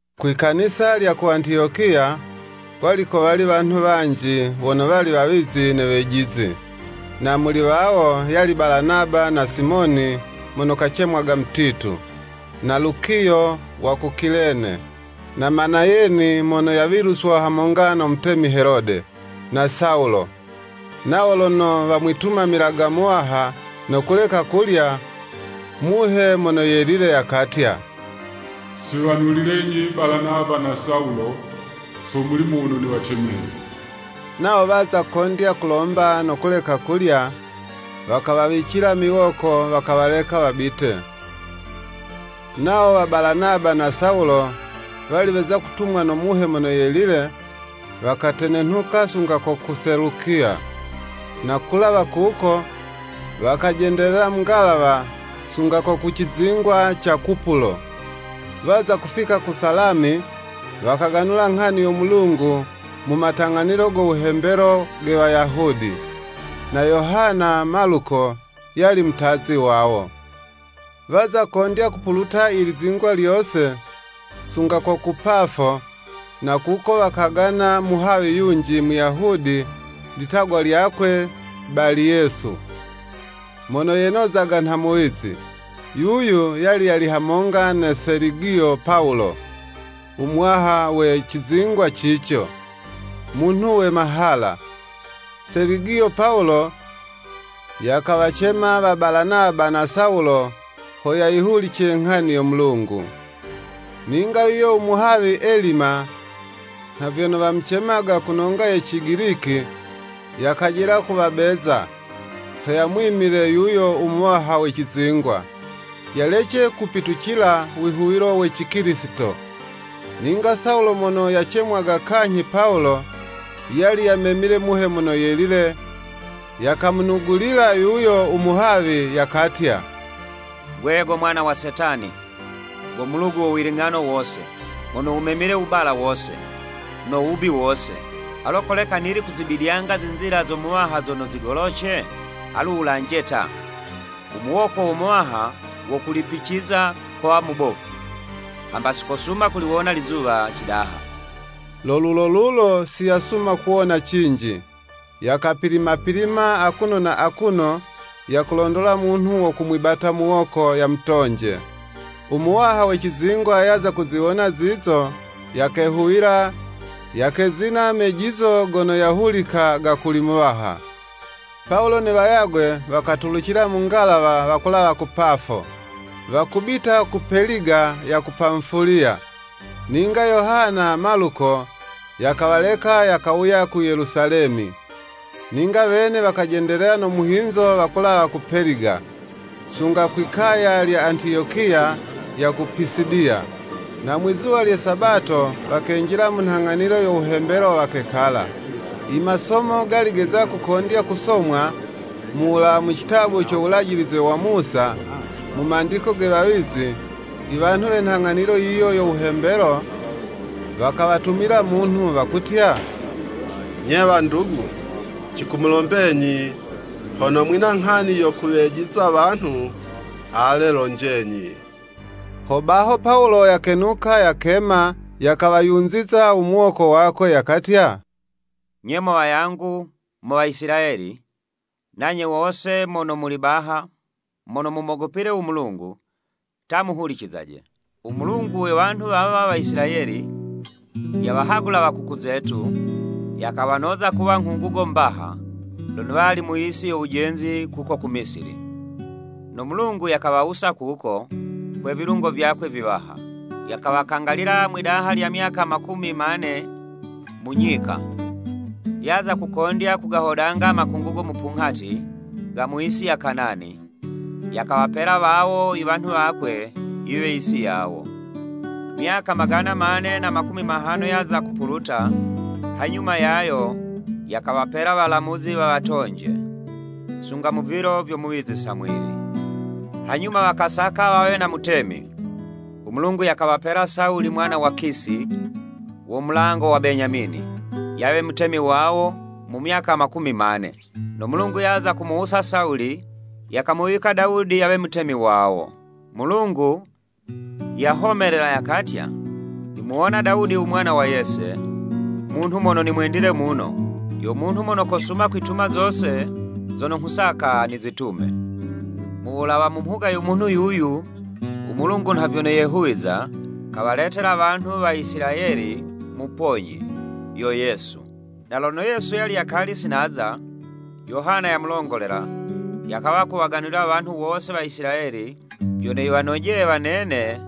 Kwi Kanisa lya ku Antiyokiya, kwali kowali wanhu wanji wono wali wawizi ne wejizi, na muli wawo, yali Balanaba na Simoni mono kacemwaga Mutitu, na Lukiyo wa ku Kilene, na Manayeni mono yawiluswa hamonga no mutemi Helode, na Sawulo. Nawo lono wamwitumamilaga Muwaha, no kuleka kulya, Muhe Mono Yelile yakatya, “Siwanulilenyi Balanaba na Sawulo so mulimo wono niwacemeye.” Nawo waza kondya kulomba no kuleka kulya, wakawawicila miwoko wakawaleka wabite. Nawo wa Balanaba na Sawulo, wali weza kutumwa no Muhe Mono Yelile, wakatenenhuka sunga ko ku Selukiya, no kulawa kuko wakajendelela mu ngalawa sunga ko ku cizingwa ca Kupulo. Waza kufika ku Salami, wakaganula nghani yo Mulungu mu matang'anilo go wuhembelo ge Wayahudi. Na Yohana (Maluko) yali mutazi wawo. Waza kondya kupuluta ilizingwa lyose, sunga ko ku Pafo, na kuko wakagana muhawi yunji, Muyahudi, litagwa lyakwe Baliyesu, mono yenozaga nha muwizi. Yuyu yali yali hamonga na Seligiyo Pawulo, u muwaha we cizingwa cico, munhu we mahala. Seligiyo Pawulo, yakawacema wa Balanaba na Sawulo ho yayihulice nghani yo Mulungu. Ninga yuyo u muhawi Elima, (nha vyono wamucemaga ku nonga ye Cigiliki) yakajela kuwabeza, ho yamwimile yuyo u muwaha we cizingwa, yalece kupitucila wihuwilo we Cikilisito. Ninga Sawulo mono yacemwaga kanyhi Pawulo, yali yamemile Muhe Mono Yelile, yakamunugulila yuyo u muhawi, yakatya, “Gwe go mwana wa Setani, go mulugu wo wiling'ano wose, mono wumemile wubala wose, no wubi wose, alo koleka nili kuzibidyanga zinzila zo Muwaha zono zigoloce? Alu wulanje ta, u muwoko wo Muwaha wo kulipiciza, kowa mubofu, hamba si kosuma kuliwona lizuwa cidaha.” Lu lulo lulo siyasuma kuwona cinji, yakapilima pilima akuno na akuno yakulondola munhu wo kumwibata muwoko, yamutonje. U Muwaha we cizingwa yaza kuziwona zizo, yakehuwila, yakezina mejizo gono yahulika ga kuli Muwaha. Pawulo ne wayagwe wakatulucila mu ngalawa wakulawa ku Pafo, wakubita ku Peliga ya ku Pamufuliya, ninga Yohana (Maluko) yakawaleka yakawuya ku Yelusalemi. Ninga wene wakajendelela no muhinzo wakulawa ku Peliga, sunga kwi kaya lya Antiyokiya ya ku Pisidiya. Na mwizuwa lye Sabato wakenjila mu nhang'anilo yo wuhembelo wakekala. Imasomo gali geza kukondya kusomwa, mu wulawa mu citabu co Wulajilize wa Musa, mu mandiko ge wawizi, iwanhu we nhang'anilo yiyo yo wuhembelo, wakawatumila munhu, wakutya, “Nye wandugu, cikumulombenyi hono mwina nghani yo kuwejiza wanhu, ale lonjenyi.” Hobaho Pawulo yakenuka yakema, yakawayunziza u muwoko wakwe, yakatya, “Nye mo wayangu mo wa Isilayeli, nanye wose mono muli baha mono mumogopile u Mulungu, ta muhulicizaje! U Mulungu we wanhu wawa Waisilayeli, yawahagula wakuku zetu, yakawanoza kuwa nghungugo mbaha, lono wali mu yisi yo wujenzi kuko ku Misili. No Mulungu yakawawusa kuko, kwe vilungo vyakwe viwaha. Yakawakangalila mwidaha lya myaka makumi mane mu nyika. Yaza kukondya kugahodanga makungugo mupunghati, ga mu yisi ya Kanani, yakawapela wawo iwanhu wakwe yiwe yisi yawo. Myaka magana mane na makumi mahano yaza kupuluta, hanyuma yayo, yakawapela walamuzi wawatonje, sunga mu vilo vyo muwizi Samwili. Hanyuma wakasaka wawe na mutemi, u Mulungu yakawapela Sawuli mwana wa Kisi, wo mulango wa Benyamini, yawe mutemi wawo mu myaka makumi mane. No Mulungu yaza kumuwusa Sawuli, yakamuwika Dawudi yawe mutemi wawo. Mulungu yahomelela, yakatya, ‘Nimuwona Dawudi u mwana wa Yese, munhu mono nimwendile muno, yo munhu mono kosuma kwituma zose zono nghusaka nizitume.’ Mu wulawa mu mhuga yo munhu yuyu, u Mulungu nha vyono yehuwiza, kawaletela wanhu wa Isilayeli Muponyi, yo Yesu. Na lono Yesu yali yakali sinaza, Yohana yamulongolela, yakawa kuwaganulila wanhu wose wa Isilayeli, vyono yiwanojeye wanene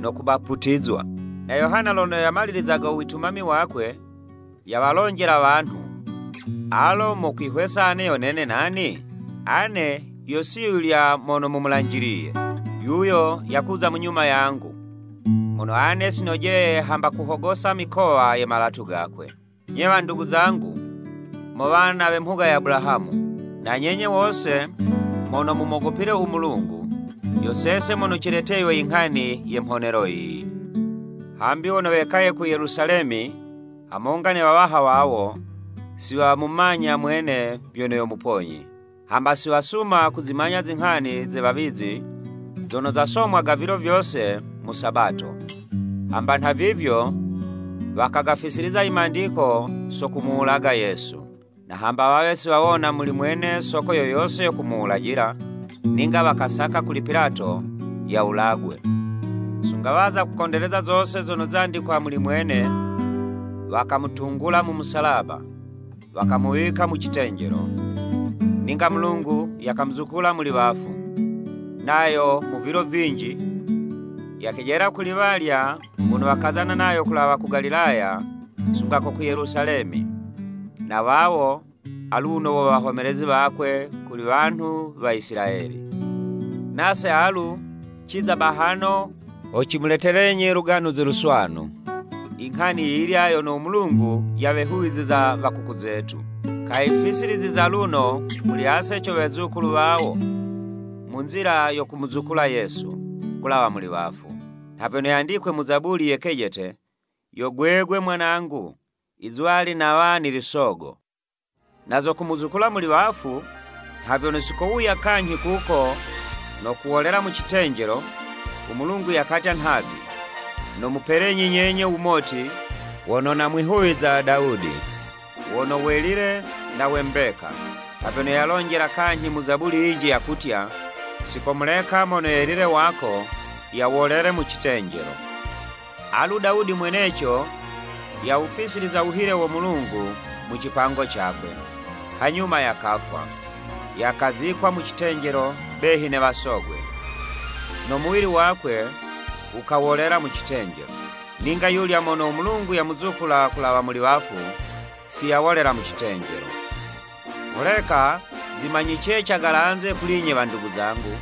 no kubaputizwa. Na Yohana lono yamalilizaga witumami wakwe, yawalonjela wanhu, ‘Alo mukwihwesa ane yo nene nani? Ane yo si yulya mono mumulanjiliye. Yuyo yakuza munyuma yangu, mono ane si nojeye hamba kuhogosa mikowa ye malatu gakwe.’ “Nye wandugu zangu mo wana we mhuga ya Abulahamu, na nyenye wose mono mumogopile u Mulungu! Yo sese mono cileteywe inghani ye mhonelo yiyi. Hambi wono wekaye ku Yelusalemi, hamonga ne wawaha wawo, si wamumanya mwene vyono yo Muponyi. Hamba si wasuma kuzimanya zinghani ze wawizi zono zasomwaga vilo vyose mu Sabato. Hamba nhavivyo wakagafisiliza i mandiko so kumuwulaga Yesu. Na hamba wawe si wawona muli mwene soko yo yose yo kumuwulajila, ninga wakasaka kuli Pilato, yawulagwe. Sunga waza kukondeleza zose zono zandikwa muli mwene, wakamutungula mu musalaba, wakamuwika mu citenjelo. Ninga Mulungu yakamuzukula muli wafu. Nayo mu vilo vinji, yakejela kuli walya wono wakazana nayo kulawa ku Galilaya sunga ko ku Yelusalemi. Na wawo, aluno wo wahomelezi wakwe kuli wanhu wa Isilayeli. Nase alu, ciza bahano, ho cimuletelenyi u Luganuzi Luswanu, inghani yiyilya yono u Mulungu yawehuwiza wa kuku zetu, kayifisiliziza luno muli ase co wezukulu wawo, mu nzila yo kumuzukula Yesu, kulawa muli wafu. Nha vyono yandikwe mu Zabuli ye kejete, ‘Yo gwegwe mwanangu Izuwali nawa nili sogo.’ “Na zo kumuzukula muli wafu, na vyono sikowuya kanyhi kuko no kuwolela mu citenjelo, u Mulungu yakatya nhavi! ‘Nomupelenyi nyenye wumoti wono namwihuwiza Dawudi, wono welile na we mbeka.’ Nha vyono yalonjela kanyhi mu Zabuli yinji yakutya, ‘Sikomuleka mono welile wako yawolele mu citenjelo.’ Alu Dawudi mweneco, yawufisiliza wuhile wo Mulungu mu cipango cakwe, hanyuma yakafwa, yakazikwa mu citenjelo behi ne wasogwe, no muwili wakwe wukawolela mu citenjelo. Ninga yulya mono u Mulungu yamuzukula kulawa muli wafu, siyawolela mu citenjelo. Holeka zimanyice cagalanze kuli'nye wandugu zangu,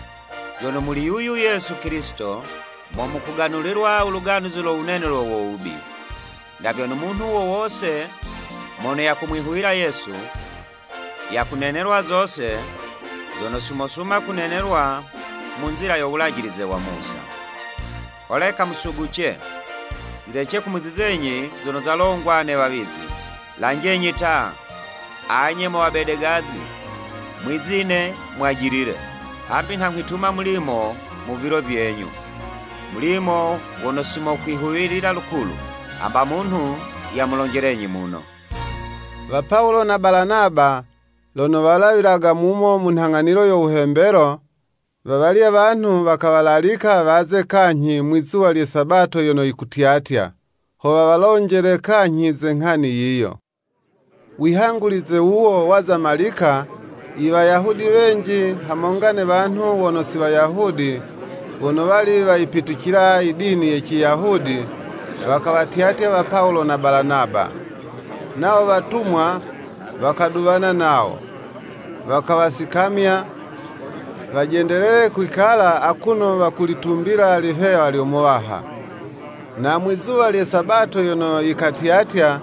vyono muli yuyu Yesu Kilisito, mo mukuganulilwa u Luganuzi lo wunenelwe wo wubi, na vyono munhu wo wose mono yakumwihuwila Yesu, yakunenelwa zose zono si mosuma kunenelwa mu nzila yo Wulajilize wa Musa. Holeka musuguce, zilece kumuzizenyi zono zalongwa ne wawizi, ‘Lanjenyi ta, anye mo wabedegazi, mwizine mwajilile! Hambi nha nghwituma mulimo mu vilo vyenyu, Mulimo wono si mokwihuwilila lukulu, hamba munhu yamulonjelenyi muno.'" Wa Pawulo na Balanaba lono walawilaga mumo mu nhang'anilo yo wuhembelo, wawalya wanhu wakawalalika waze kanyhi, mwi'zuwa lye Sabato yono yikutyatya, ho wawalonjele kanyhi ze nghani yiyo. Wihangulize wuwo waza malika, Iwayahudi wenji, hamonga ne wanhu wono si Wayahudi, wono wali wayipitucila i dini ye Ciyahudi, wakawatyatya wa Pawulo na Balanaba. Nawo watumwa, wakaduwana nawo, wakawasikamya, wajendelele kwikala akuno wakulitumbila lihewa lyo Muwaha. Na mwizuwa lye Sabato yono yikatyatya,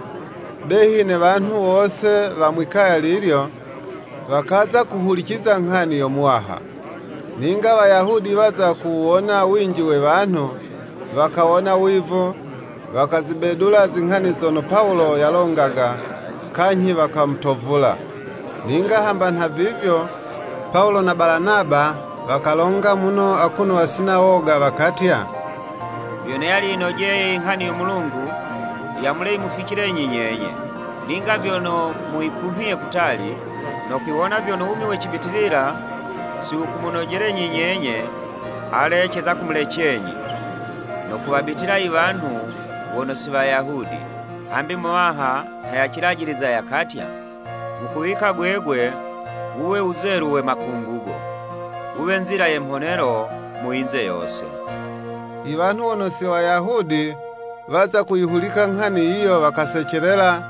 behi ne wanhu wose wa mwi'kaya lilyo, wakaza kuhuliciza nghani yo Muwaha. Ninga Wayahudi waza kuwuwona winji we wanhu, wakawona wivu, wakazibedula zinghani zono Pawulo yalongaga, kanyhi wakamutovula. Ninga hamba nha vivyo, Pawulo na Balanaba, wakalonga muno akuno wasina woga, wakatya, “Vyo yali yinojeye Inghani yo Mulungu yamule yimuficilenyi nyenye. Ninga vyono muyikumhiye kutali, no kwiwona vyono wumi we cibitilila si wukumunojelenyi nyenye, ale, ceza kumulecenyi, no kuwabitila i wanhu wono si Wayahudi. Hambi Muwaha nha yacilajiliza yakatya, ‘Nghukuwika gwegwe wuwe wuzelu we makungugo, Wuwe nzila ye mhonelo mu yinze yose.'" Iwanhu wono si Wayahudi, waza kuyihulika nghani yiyo, wakasecelela,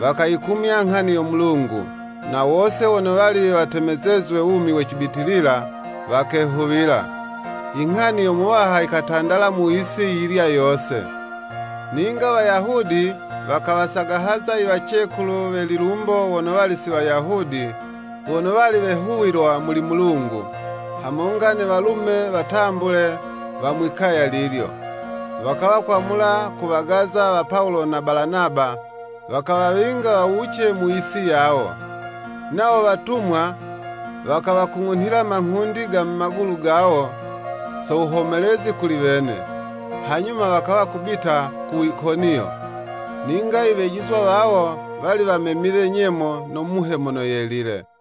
wakayikumya nghani yo Mulungu, na wose wono wali watemezezwe wumi we cibitilila, wakehuwila. Inghani yo Muwaha yikatandala mu yisi yiyilya yose. Ninga Wayahudi wakawasagahaza iwacekulu we lilumbo wono wali si Wayahudi, wono wali wehuwilwa muli Mulungu, hamonga ne walume watambule wa mwi'kaya lilyo. Wakawa kwamula kuwagaza wa Pawulo na Balanaba, wakawawinga wawuce mu yisi yawo. Nawo watumwa, wakawakung'unhila manghundi ga mu magulu gawo, so wuhomelezi kuli wene, hanyuma wakawa kubita ku Ikoniyo. Ninga iwejizwa wawo, wali wamemile nyemo, no Muhe Mono Yelile.